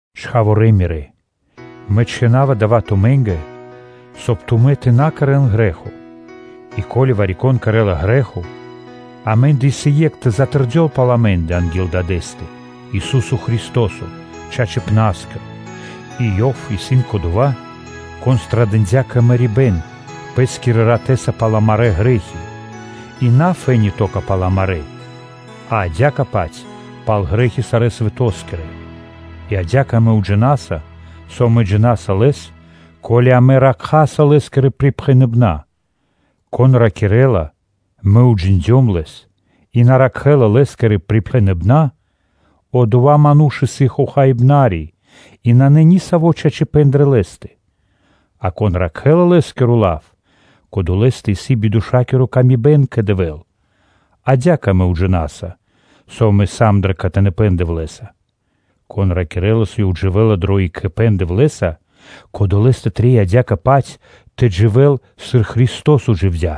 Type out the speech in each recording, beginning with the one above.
Чхаворалэ мирэ́! Мэ чхина́ва дава́ тумэ́нгэ, соб (кай) тумэ́ тэ на кэрэ́н грэ́хо, и ко́ли вари-кон кэрэ́ла грэ́хо, амэ́ндэ исын Екх тэ тэрдёл пал амэ́ндэ анги́л Дадэ́стэ-Ису́со Христо́со, Чачипна́скиро; и Ёв исын Кодова́, Кон пирилыджия пхарипэ́н кэ мэрибэ́н Пэ́скирэ ратэ́са пал амарэ́ грэ́хи сы́рбы свэ́нто дыибэ́н, и на фэ́ни (то́ка) пал амарэ́, а адя́кэ-паць пал грэ́хи сарэ́ свэто́скирэ. И адя́кэ амэ уджинаса, со амэ джина́са Лэс, ко́ли амэ ракхаса Лэ́скирэ припхэныбэна́. Кон ракирэ́ла: “Мэ уджиндём Лэс” и на ракхэ́ла Лэ́скирэ припхэныбэна́, одова́ ману́ш исын хохаибнари, и нанэ нисаво́ чачипэ́н дрэ лэ́стэ; а кон ракхэ́ла Лэ́скиро лав, кодолэстэ исын бидошакиры паты́в кэ Дэвэ́л. Адя́кэ амэ уджинаса, со амэ сам дро кхэтаныпэн Дэвлэ́са. Кон ракирэ́ла, со ёв дживэ́ла дро екхипэ́н Дэвлэ́са, кодолэ́скэ трэй адя́кэ-паць тэ дживэ́л сыр Христо́со дживдя́.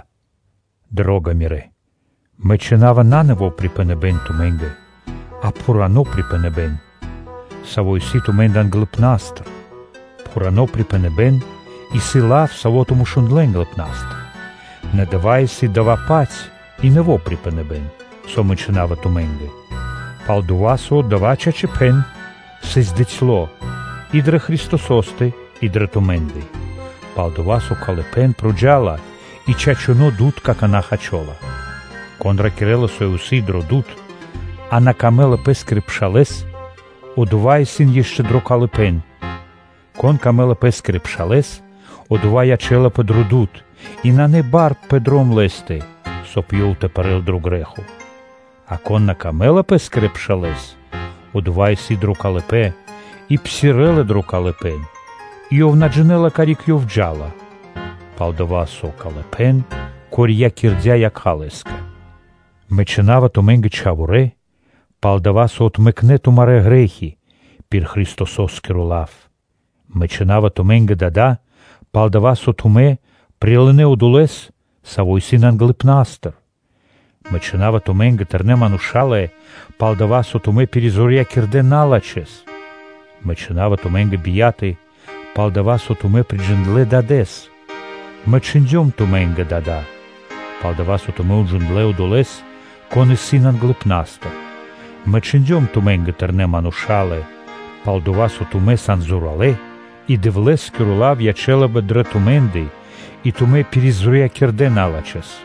Дро́га мирэ́! Мэ чхина́ва на нэво́ припхэныбэ́н тумэ́нгэ, а пхурано́ припхэныбэ́н, саво́ исын тумэ́ндэ англыпна́стыр. Пхурано́ припхэныбэ́н исын лав, саво́ тумэ́ шундлэ́ англыпна́стыр. Нэ дава́ исын дава́-паць и нэво́ припхэныбэ́н, со мэ чхина́ва тумэ́нгэ, пал-дова́ со дава́ чачипэ́н сыс бицяло́ и дрэ Христосо́стэ и дрэ тумэ́ндэ: пал-дова́ со калыпэ́н проджа́ла и чачуно́ дуд какана́ хачола. Кон ракирэ́ла, со ёв исын дро дуд, а лэ́скэ исын надрого пэ́скиро пшал, одова́ исын ишчо (инкэ́) дро калыпэ́н. Конэ́скэ исын дро́го лэ́скиро пшал, одова́ ячэ́лапэ дро дуд, и нанэ бар пэ дром лэ́стэ, соб (кай) ёв тэ пэрэ́л дро грэ́хо; а конэ́скэ исын надрого пэ́скиро пшал, одова́ исын дро калыпэ́н, и псирэ́ла дро калыпэ́н, и ёв на джинэ́ла, карик ёв джа́ла, пал-дова́ со калыпэ́н корьякирдя якха́ лэ́скэ. Мэ чхина́ва тумэ́нгэ, чхаворэ́, пал-дова́ со отмэкнэ тумарэ́ грэ́хи пир Христосо́скиро лав. Мэ чхина́ва тумэ́нгэ, дада́, пал-дова́ со тумэ́ прилынэ́ Одолэ́с, Саво́ исын англыпна́стыр. Мэ чхина́ва тумэ́нгэ, тэрнэ́ мануша́лэ, пал-дова́ со тумэ́ пиризорьякирдэ налачхэ́с. Мэ чхина́ва тумэ́нгэ, бияталэ, пал-дова́ со тумэ́ приджиндлэ Дадэ́с. Мэ чхиндём тумэ́нгэ, дадолэ, пал-дова́ со тумэ́ уджиндлэ́ Одолэ́с, Кон исын усады (сак) англыпна́стыр [Дадэ́стэ-ю.о.]. Мэ чхиндём тумэ́нгэ, тэрнэ́ мануша́лэ, пал-дова́ со тумэ́ сан зоралэ́; и Дэвлэ́скиро лав ячэ́лапэ дрэ тумэ́ндэ и тумэ́ пиризорьякирдэ налачхэ́с.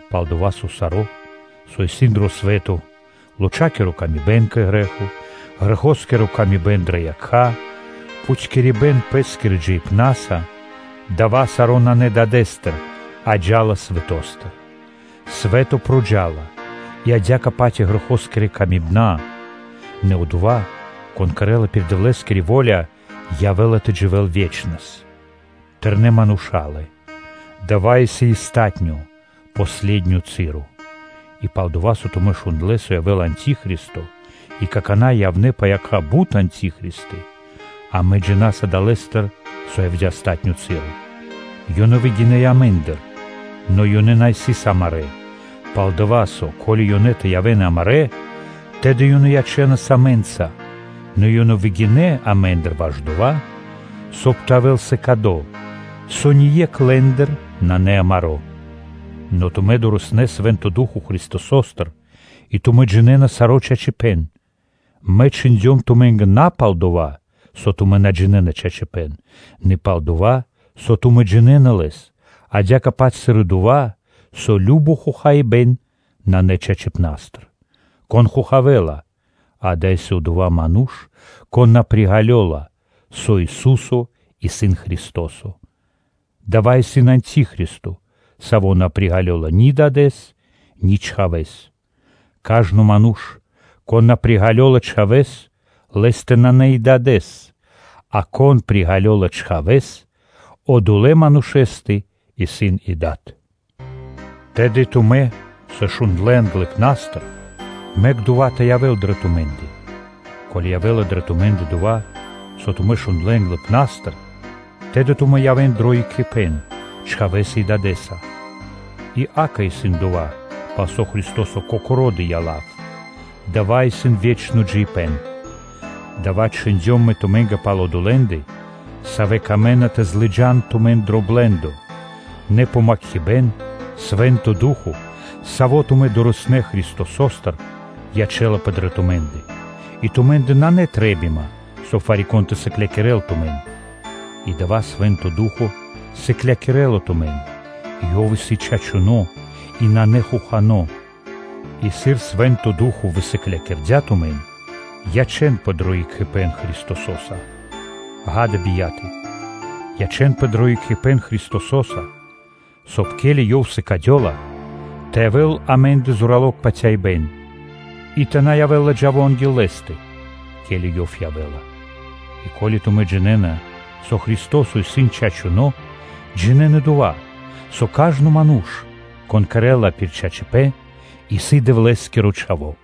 пал-дова́ со саро́, со исын дро свэ́то: лочакиро тырдыпэ́н кэ грэ́хо, грэхоскиро камибэн дрэ якха́, пхутькирибэ́н пэ́скирэ джиибнаса, дава́ саро́ нанэ Дадэ́стыр, а джа́ла свэто́стыр. Свэ́то проджа́ла и адя́кэ-паць и грэхоскирэ камибэна, нэ одова́, кон кэрэ́ла пир Дэвлэ́скири во́ля, явэ́ла тэ дживэ́л ве́чнэс. Тэрнэ́ мануша́лэ! Дава́ исын палатуно́ (последнё) часо. И пал-дова́ со тумэ́ шундлэ́, со явэ́ла антихристо и какана́ явнэ́ пэ якха́ бут антихристы, амэ джина́са далэ́стыр, со явдя́ палатуно́ часо. Ёнэ выгинэ́ амэ́ндыр, нэ ёнэ на сыс амарэ́; пал-дова́ со, ко́ли ёнэ тэ явэ́н амарэ́, тэды ёнэ ячэнас амэ́нца, нэ ёнэ выгинэ́ амэ́ндыр ваш дова́, соб (кай) тэ явэ́л сыкадо, со ние́кх лэ́ндыр нанэ амаро́. Нэ тумэ́ дорэснэ́ Свэ́нто Ду́хо (Фа́но) Христосостыр, и тумэ́ джинэ́на саро́ чачипэ́н. Мэ чхиндём тумэ́нгэ на палдова́ со тумэ́ на джинэ́на чачипэ́н, нэ пал-дова́ со тумэ́ джинэ́на лэс, адя́кэ-паць сыр и дова́, со кажно хохаибэ́н нанэ чачипнастыр. Кон хохавэла? Адава́ исын одова́ ману́ш, кон на приґалёла, со Ису́со исын Христо́со? Дава́ исын антихристо, саво́ на приґалёла ни Дадэ́с, ни Чхавэ́с. Кажно ману́ш, кон на приґалёла Чхавэ́с, лэ́стэ нанэ и Дадэ́с, а кон приґалёла Чхавэ́с, одолэ́ манушэ́стэ исын и Дад. Тэды тумэ́, со тумэ́ шундлэ́ англыпна́стыр, мэк дова́ тэ явэ́л дрэ тумэ́ндэ; ко́ли явэ́ла дрэ тумэ́ндэ, дова́, со тумэ́ шундлэ́ англыпна́стыр, тэды тумэ́ явэ́на дро екхипэ́н Чхавэ́са и Дадэ́са. И, акэ, исын дова́, пал со Христо́со Кокоро́ дыя́ лав, дава́ исын ве́чно джиибэ́н. Дава́ чхиндём мэ тумэ́нгэ пал одолэ́ндэ, савэ́ камэ́на тэ лыджа́н тумэн дро блэ́ндо: нэ помакхибэн, Свэ́нто Ду́хо (Фа́но), Саво́ тумэ́ дорэснэ́ Христосостыр, ячэ́лапэ дрэ тумэ́ндэ, и тумэ́ндэ нанэ трэ́бима, соб (кай) вари-кон тэ сыклякирэ́л тумэн. И дава́ Свэ́нто Ду́хо (Фа́но) сыклякирэ́ла тумэн, и Ёв сыс чачуно́ и нанэ хохано́. И сыр Свэ́нто Ду́хо (Фа́но) высыклякирдя тумэн, ячэ́нпэ дро екхипэ́н Христосо́са. Ѓа́да, бияты, ячэ́нпэ дро екхипэ́н Христосо́са, соб (кай) Ёв, ке́ли сыкадёла, тэ явэ́л амэ́ндэ зорало́ патяибэ́н и тэ на явэ́л ладжаво анги́л Лэ́стэ, ке́ли Ёв явэ́ла. И ко́ли тумэ́ джинэ́на, со Христо́со исын чачуно́, джинэ́н и дова́, со кажно ману́ш, кон кэрэ́ла пир чачипэ́н, исын Дэвлэ́скиро чхаво́.